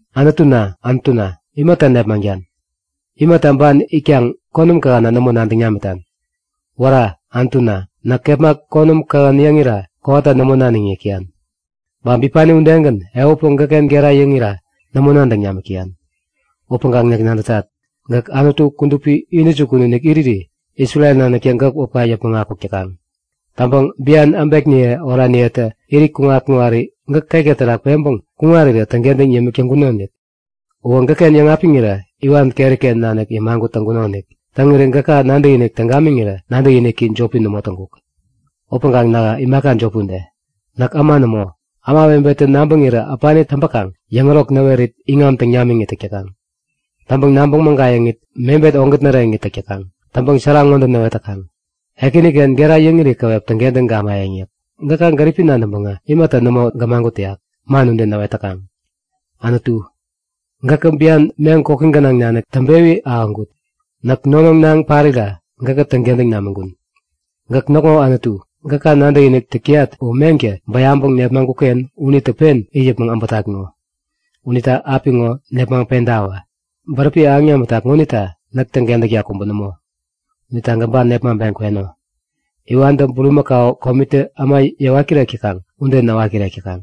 Anutuna, Anutuna, imata nepmaŋtan? Imata ban itkaŋ konäm kähänna nämo nadäŋ namitan? Wära! Anutuna, näk kepma konäm kähän yäŋira kowata nämo naniŋ yäk täyan. Ba bipani udegän ehutpäŋ gäkken gera yäŋira nämo nadäŋ namik täyan. Upäŋkaŋ näk nadätat; Gäk Anutu kudupi intäjukun iriri Isrel naniktä gäk wäpka yäpmäŋ akuk täkaŋ. Täŋpäŋ bian äbekniye oraniyetä irit kuŋat-kuŋari gäk ketka terak peŋpeŋ kuŋarirä täŋkentäŋ yämik täŋkunonik. Uwä gäkken yäŋapiŋirä iwan keriken nanik yämagut täŋkunonik. Täŋiri gäka nadäkinik täŋ gamiŋirä nadäkiniki jopi nämo täŋkuk. Upäŋkaŋ nähä imaka jopi ude. Näk äma nämo! Ämawebetä nabäŋirä äpani täŋpäkaŋ yäŋärok näwerit iŋam täŋ namiŋit täk täkaŋ. Täŋpäŋ nabäŋ mägayäŋit mebet ogät näreŋit täk täkaŋ. Täŋpäŋ sära ŋode näwet täkaŋ; Ekäniken gera yäŋiri käwep täŋkentäŋ gamayäŋ yäk. Gäka gäripi nadäŋpäŋä imata nämo gämagut täyak? Man ude näwet täkaŋ. Anutu, gäkä bian meŋ koki gänaŋ nanik täŋpewi ahäŋkut. Näk nonoŋ naŋ parira gäkä täŋkentäŋ namiŋkun. Gäk näkŋo Anutu. Gäka nadäkinik täk täyat uwä meŋtä bäyaŋpäŋ nepmaŋkukken unitä pen it yäpmäŋ äbätat ŋo. Unita apiŋo nepmaŋpentawä! Bäräpi ahäŋ namitak ŋonita näk täŋkentäkta kubä nämo! Unita gäk ban nepmaŋpeŋ kweno. Iwantä bulimakau komitä äma yäwat-kirek täkaŋ ude näwat-kirek täkaŋ.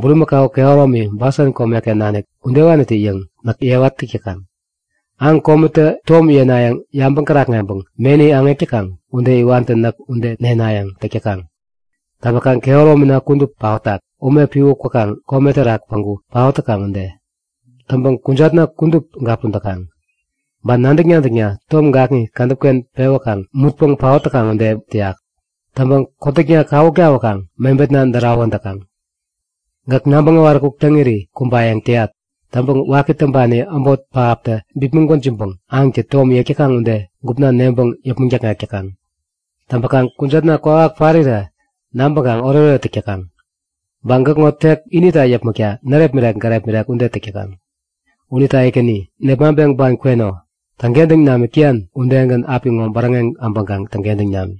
Burimäkau kehäromi Basan komeken nanik udewanitä-yäŋ näk yewa täk täkaŋ. Aŋ komitä tom yenayäŋ yabäŋ kärakŋeŋpäŋ meni aŋek täkaŋ ude iwantä näk ude nenayäŋ täk täkaŋ. Täŋpäkaŋ kehäromina kudup paotak, ume piwä kwäkaŋ kome terak päŋku paot täkaŋ ude. Täŋpäŋ kujatna kudup gapun täkaŋ. Ba nadäk-nadäkna tom gakŋi kädäpken pewäkaŋ mutpäŋ paot täkaŋ ude täyak. Täŋpäŋ kotäkna kawuk tawäkaŋ mebetna därawän täkaŋ. Gäk nabäŋ näwaräkuk täŋiri kumbayäŋ täyat. Täŋpäŋ waki täŋpani äbot pähaptä bipmäŋ gwäjiŋpäŋ aŋtä tom yek täkaŋ ude gupna neŋpäŋ yäpmäŋ däkŋek täkaŋ. Täŋpäkaŋ kujatna kwawak parirä nabäŋkaŋ oretoret täk täkaŋ. Ba näkŋo tek inita yäpmäkta närepmirek-gärepmirek ude täk täkaŋ. Unita Ekäni, nepmaŋpeŋ ban kweno. Täŋkentäŋ namik täyan udegän apiŋo bäräŋeŋ abäŋkaŋ täŋkentäŋ nam!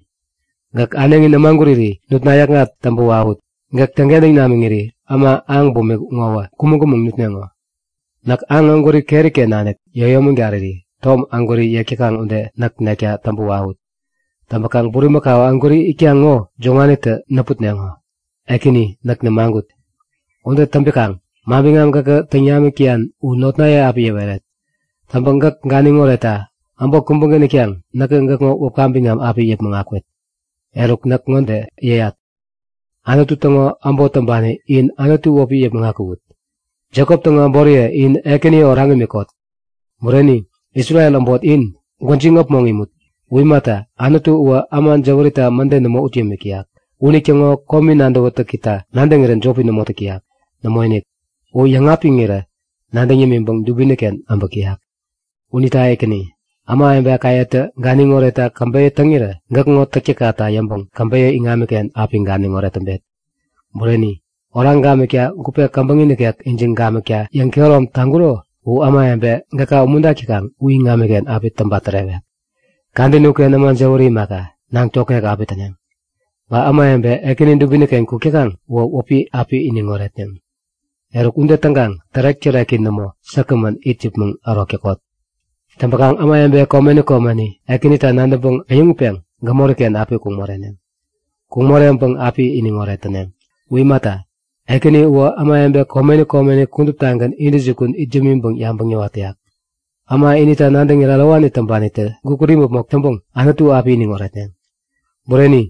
Gäk äneŋi nämaguriri nutna yäkŋat täŋpä wawut! Gäk täŋkentäŋ namiŋiri äma aŋ bumik ŋowä kumäŋ-kumäŋ nutneŋo. Näk aŋ ägwäri keriken nanik yäyomägariri tom ägwäri yek täkaŋ ude näk nekta täŋpä wawut! Täŋpäkaŋ bulimakau ägwäri itkaŋ ŋo joŋanitä näputneŋo, Ekäni näk nämagut. Ude täŋpikaŋ manbiŋam gäkä täŋ namik täyan u notnaye api yäweret. Täŋpäŋ gäk ganiŋ oretta äbot kubägän itkaŋ näkä gäkŋo wäpka biŋam api yäpmäŋ akwet. Eruk näk ŋode yäyat; Anutu täŋo äbot täŋpani in Anutu wäpi yäpmäŋ akuwut! Jekop täŋo äboriye in Ekäni oraŋ imikot! Bureni, Isrel äbot in, gwäjiŋ äpmoŋ imut! U imata, Anutu uwä äma jäwärita mäde nämo ut yämik täyak. Unitäŋo komi nadäwätäkita nadäŋirän jopi nämo täk täyak. Nämoinik! U yäŋapiŋirä nadäŋ yämiŋpäŋ dubiniken äbäk täyak. Unita Ekäni, ämawebekayetä ganiŋ oretta käbeyä täŋirä gäkŋo täktäkkata yäŋpäŋ käbeyä iŋamiken api ganiŋoret täŋpet. Bureni, oraŋ gamikta gupe käbäŋi nikek ijiŋ gamikta yäŋkehärom taŋkuro u ämawebe gäka umuntak täkaŋ u iŋamiken api täŋpa-tärewek. Kadäni uken äma jäwäri imaka, naŋ tokŋek api täneŋ. Ba ämawebe Ekäni dubiniken kuk täkaŋ uwä wäpi api iniŋ oretneŋ. Eruk, ude täŋkaŋ tärek-täreki nämo säkgämän it yäpmäŋ ärok täkot! Täŋpäkaŋ ämawebe komeni komeni Ekänita nadäŋpäŋ äyäŋutpeŋ gämoriken api kuŋ moreneŋ. Kuŋ moreŋpäŋ api iniŋoret täneŋ. U imata, Ekäni uwä ämawebe komeni komeni kuduptagän intäjukun it yämiŋpäŋ yabäŋ yäwat täyak. Äma inita nadäŋirä ärowani täŋpanitä gukut imäpmok täŋpäŋ Anutu api iniŋ oretneŋ. Bureni,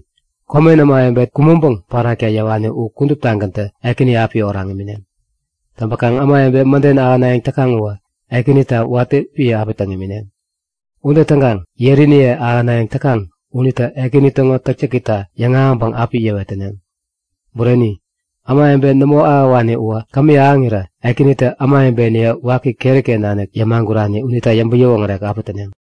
komen ämawebe kumäŋpäŋ parakta yäwani u kuduptagäntä Ekäni api oraŋ imineŋ. Täŋkaŋ ämawebe mäden ahänayäŋ täkaŋ uwä Ekänita watä piä api täŋ imineŋ. Ude täŋkaŋ yeriniye ahänayäŋ täkaŋ unita Ekäni täŋo täktäkita yäŋahäŋpäŋ api yäwet täneŋ. Bureni, ämawebe nämo ahäwani uwä kämi ahäŋirä Ekänitä ämawebeniye waki keriken nanik yämagurani unita yäŋpäŋ-yäwoŋärek api täneŋ.